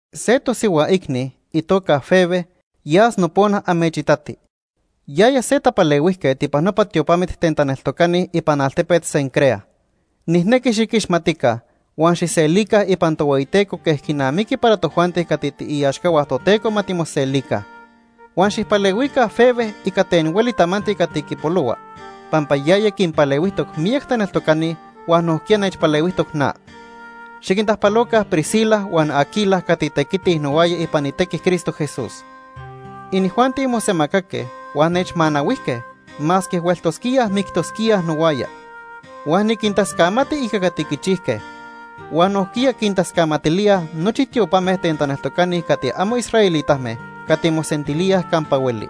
Se tosihua icni, itoca Febe, yas nopona amechitati. Yaya se tapalehuijquet ipan nopa tiopamit ten taneltocani ipan altepet Cencrea. Nijnequi xiquixmatica, huan xijselica ipan Tohueyiteco quej quinamiqui para tojuanti cati tiiaxcahua Toteco ma timoselica. Huan xijpalehuica Febe ica ten hueli tamanti cati quipolohua pampa yaya quinpalehuijtoc miyac taneltocani huan nojquiya nechpalehuijtoc na. Xiquintajpaloca Priscila huan Aquila cati tequitij nohuaya ipan itequi Cristo Jesús. Inijuanti mosemacaque huan nechmanahuijque, masque hueltosquíaj mictosquíaj nohuaya. Huan niquintascamati ica cati quichijque. Huan nojquiya quintascamatilíaj nochi tiopame ten taneltocani cati amo israelitame cati mosentilíaj campa hueli.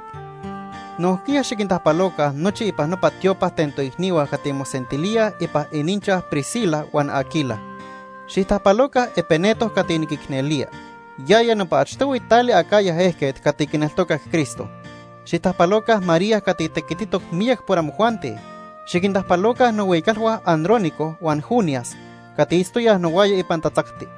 Nojquiya xiquintajpaloca nochi ipan nopa tiopa ten toicnihua cati mosentilíaj ipan ininchaj Priscila huan Aquila. Xijtajpaloca Epeneto cati niquicnelía. Yaya nopa achtohui tali Acaya ejquet cati quineltocac Cristo. Xijtajpaloca María cati tequititoc miyac por amojuanti. Xiquintajpaloca nohuicalhua Andrónico huan Junias cati itztoyaj nohuaya ipan tatzacti.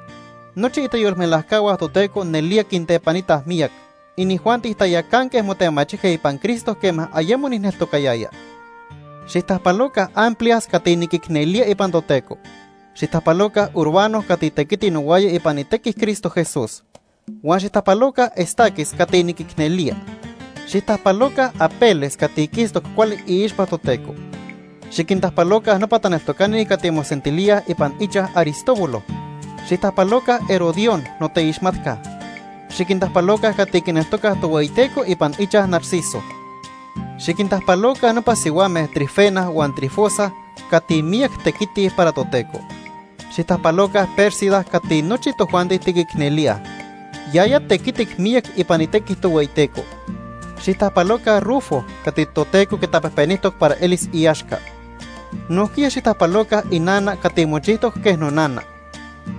Nochi itayolmelajcahua Toteco nelía quintepanitaj miyac. Inijuanti tayacanque motemachijque ipan Cristo quema ayemo nijneltocayaya. Xijtajpaloca Amplias cati niquicnelía ipan Toteco. Xijtajpaloca Urbano cati tequiti nohuaya ipan itequi Cristo Jesús. Huan xijtajpaloca Estaquis cati niquicnelía. Xijtajpaloca Apeles cati quistoc cuali iixpa Toteco. Xiquintajpaloca nopa taneltocani cati mosentilíaj ipan ichaj Aristóbulo. Xijtajpaloca Herodión, noteixmatca. Xiquintajpaloca cati quineltocaj Tohueyiteco ipan ichaj Narciso. Xiquintajpaloca nopa sihuame Trifena huan Trifosa cati miyac tequitij para Toteco. Xijtajpaloca Pérsida cati nochi tojuanti tiquicnelíaj. Yaya tequitic miyac ipan itequi Tohueyiteco. Xijtajpaloca Rufo cati Toteco quitapejpenijtoc para elis iaxca. Nojquiya xijtajpaloca inana cati mochijtoc quej nonana.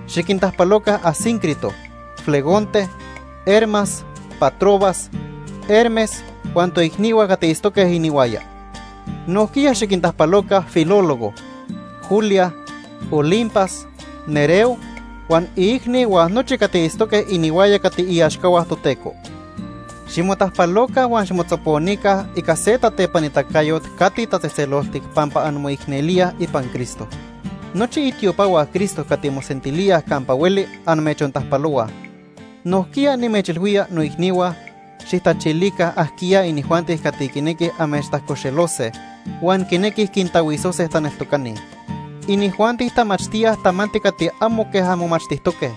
Xiquintajpaloca Asíncrito, Flegonte, Hermas, Patrobas, Hermes huan toicnihua cati itztoque inihuaya. Nojquiya xiquintajpaloca Filólogo, Julia, Olimpas, Nereo huan iicni huan nochi cati itztoque inihuaya cati iaxcahua Toteco. Ximotajpaloca huan ximotzoponica ica se tatepanitacayot cati tatzejtzeloltic pampa anmoicnelíaj ipan Cristo. Nochi itiopahua Cristo cati mosentilíaj campa hueli amechontajpalohuaj. Nojquiya, nimechilhuía, noicnihua, xijtachilica ajquiya inijuanti cati quinequij amechtajcoxelose huan quinequij quintahuisose taneltocani. Inijuanti tamachtíaj tamanti cati amo quej anmomachtijtoque.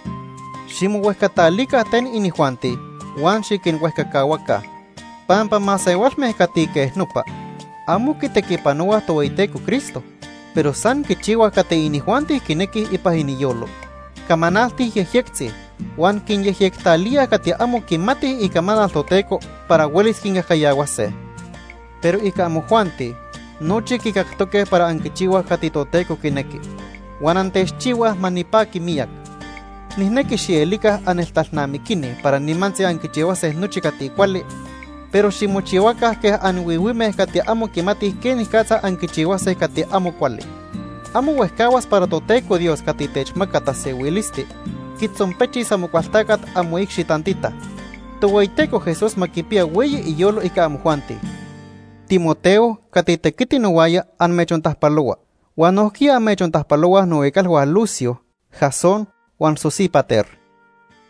Ximohuejcatalica ten inijuanti huan xiquinhuejcacahuaca. Pampa masehualme cati quej nopa amo quitequipanohuaj Tohueyiteco Cristo, pero san quichihuaj cati inijuanti quinequij ipan iniyolo. Camanaltij yejyectzi huan quinyejyectalíaj cati amo quimatij icamanal Toteco para huelis quincajcayahuase. Pero ica amojuanti, nochi quicactoque para anquichihuaj cati Toteco quinequi, huan antechchihuaj ma nipaqui miyac. Nijnequi xielica anneltalnamiquini para nimantzi anquichihuase nochi cati cuali, pero ximochihuaca quej anhuihuime cati amo anquimatij quenicatza anquichihuase cati amo cuali. Amo huejcahuas para Toteco Dios cati techmaca tasehuilisti quitzonpechis Amocualtacat amoicxi tantita. Tohueyiteco Jesús ma quipiya hueyi iyolo ica amojuanti. Timoteo cati tequiti nohuaya amechontajpalohua. Huan nojquiya amechontajpalohuaj nohuicalhua Lucio, Jasón huan Sosípater.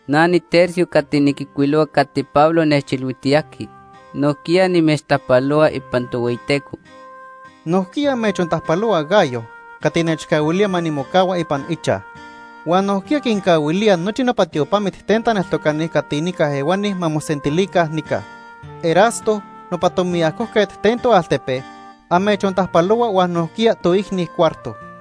Na niTercio cati niquijcuilohua cati Pablo nechilhuijtiyajqui, nojquiya nimechtajpalohua ipan Tohueyiteco. Nojquiya amechontajpalohua Gayo cati nechcahuilía ma nimocahua ipan ichaj. Huan nojquiya quincahuilía nochi nopa tiopamit ten taneltocani cati nica ehuani ma mosentilica nica. Erasto, nopa tomiajoquet ten toaltepe, amechontajpalohua huan nojquiya toicni Cuarto.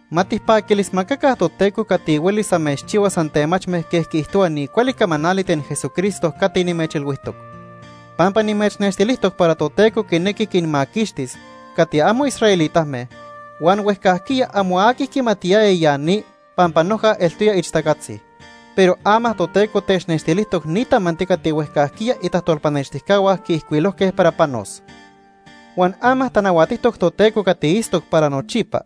Ma tijpaquilismacaca Toteco cati huelis amechchihuas antemachme quej quiijtohua ni cuali camanali ten Jesucristo cati nimechilhuijtoc. Pampa nimechnextilijtoc para Toteco quinequi quinmaquixtis cati amo israelitame huan huejcajquiya amo aqui quimatiyaya ya ni pampa noja eltoya ixtacatzi. Pero ama Toteco technextilijtoc ni tamanti cati huejcajquiya itajtolpanextijcahua quiijcuilojque para panos. Huan ama tanahuatijtoc Toteco cati itztoc para nochipa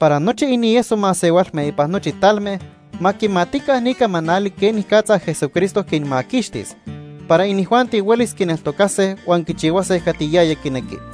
para nochi inieso masehualme ipan nochi talme ma quimatica ni camanali quenicatza Jesucristo quinmaquixtis para inijuanti huelis quineltocase huan quichihuase cati yaya quinequi.